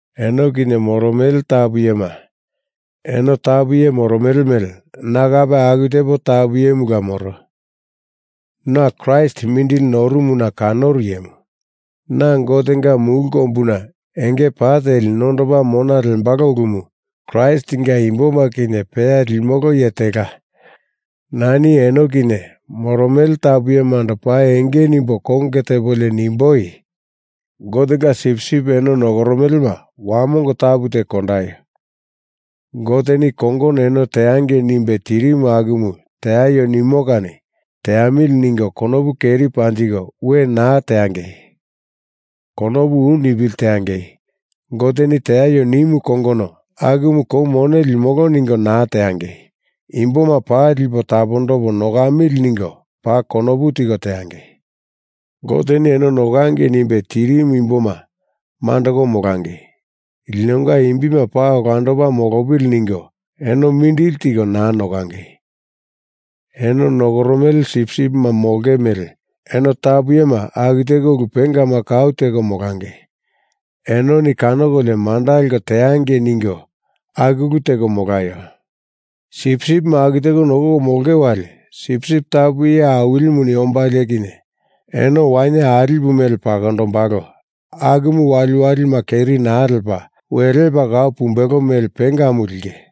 Eno kinye moromele tapu iyema, eno tapu iye moromele mele na kape aku tepo tapu iyemula moro. Na Kraist mindili norumuna kanoru iyemu, na Gotenga mulu kombuna enge pa teli nondopa mona lembalo ulumu Kraistinga imboma kinye peya limolo iye tela, nani eno kinye moromele tapu iyemando paa enge nimbo konge tepolio nimboi: Gotenga sipsip eno nokoromelema wamongo tapu teko kondaio. Goteni i kongono eno teangei nimbe tirimu akumu teaio nimo kani teamili ningo konopu keri panjiko we naa teangei. Konopu u nipili teangei. Goteni teaio nimu kongono akumu kou mone limolo ningo naa teangei. Imboma paa lipo tapondopo nokamili ningo paa konopu tiko teangei. Goteni eno nokangei nimbe tirimu imboma mandoko molangei, linonga imbima paa olandopa molopili ningo eno mindili tiko naa nokangei. Eno nokoromele sipsipima molonge mele eno tapu iyema aku teko ulu pengama kau teko molangei. Enoni kanokolio manda leko teangei ningo aku ulu teko molaio. Sipsipima aku teko nokoko molonge wali Sipsip Tapu Iye Awilimu ombalo kinye eno wainye alipu mele pakondombalo akumu waliwalima keri naa lepa, we lepa kau pumbelo mele pengamu linge.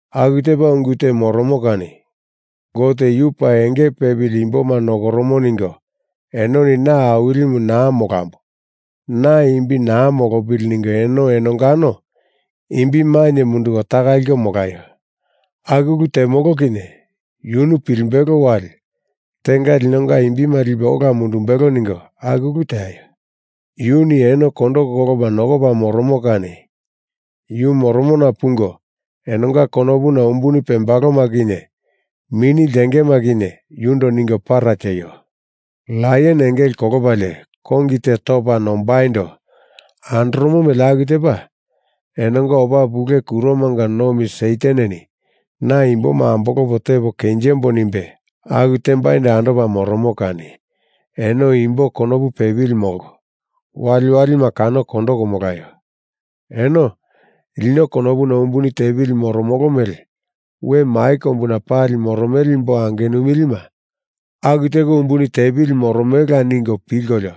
Aku tepa ungu te moromo kani Gote yu paa enge pepili imboma nokoromo ningo enoni na awilimu naa molambo, na imbi naa molopili ningo eno enongano imbi mainye munduko taka liko molaio. Aku ulu temolo kinye yunu pilimbelo wali tenga linonga imbima lipe ola mundumbelo ningo aku ulu teaio. Yuni eno kondo kolopa nokopa moromo kani yu moromona pungo enonga konopuna umbuni pembaloma kinye mini ltengema kinye yundo ningo para tieio. Laion engele kolopalie kongi te topa nombaindo andoromo mele aku tepa enonga opa pule kuromanga nomi Sataneni na imboma ambolopo tepo kenjembo nimbe aku tembaindo andopa moromo kani eno imbo konopu pepili molko, waliwalima kanoko kondoko molaio. Eno lino konopuna umbuni tepili moromolo mele we mai kombuna pali moromele imbo angenupilima aku teko umbuni tepili moromelela ningo pilkolio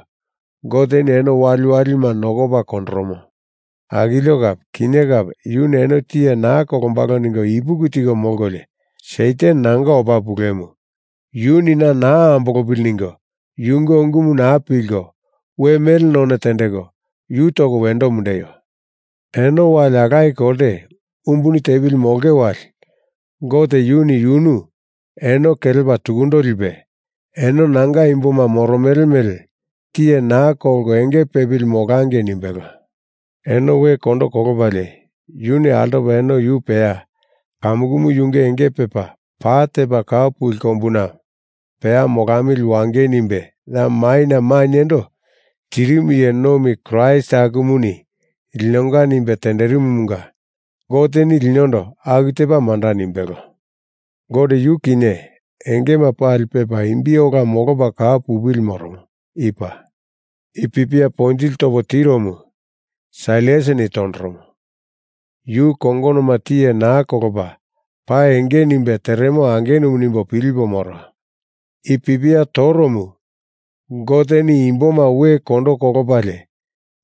Goteni eno waliwalima nokopa kondoromo. Akilio kape kinye kape yuni eno tiye naa kolombalo ningo ipuki tiko molkolio Satan nanga opa pulemu, yuni na naa ambolopili ningo yunge ungumu naa pilko, we mele none tendeko, yu toko wendo mundeio. Eno wali alaye kolte umbuni tepili molonge wali Gote yuni yunu eno kelepa tukundo lipe, eno nanga imboma moromele mele tiye naa kolko enge pepili molangei nimbelo. Eno we kondo kolopalie yuni altopa eno yu peya kamukumu yunge enge pepa pa tepa kau puli kombuna peya molamili wangei nimbe ya maina mainyendo tirimu iye nomi Kraist akumuni linonga nimbe tenderimumunga Goteni linondo aku tepa manda nimbelo. Gote yu kinye engema pali pepa imbi ola molopa kau pupili moromo. I paa. I pipia ponjili topo tiromu Sailasini tondoromo. Yu kongonoma tiye naa kolopa paa enge nimbe teremo angenumu nimbo pilipo moro. I pipia toromu Goteni imboma we kondo kolopalie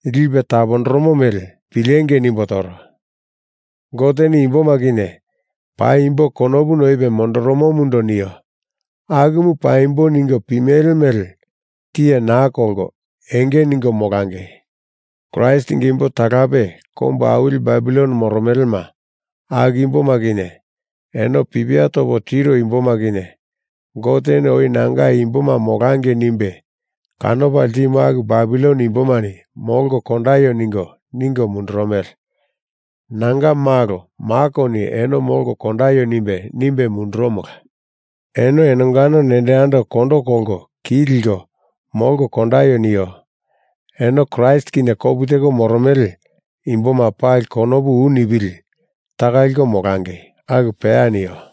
lipe tapondoromo mele pilengei nimbo toro. Goteni imboma kinye paimbo konopu noipe mondoromomundo nio akumu paimbo ningo pimele mele tiye naa kolko, enge ningo molangei. Kraistinga imbo talape kombu awili Babilon moromelema, aku imboma kinye eno pipia topo tiro imboma kinye Goteni oi Nanga imboma molangei nimbe kanopa ltimu aku Babilon imbomani molko kondaio ningo, ningo mundurumele. Nanga malo Makoni eno molko kondaio nimbe, nimbe mundurumola. Eno enongano nendo yando kondo kolko ki liko molko kondaio neio. Eno Kraist kinye kopu teko moromele imboma pali konopu u nipili taka liko molangei. Aku peya nio.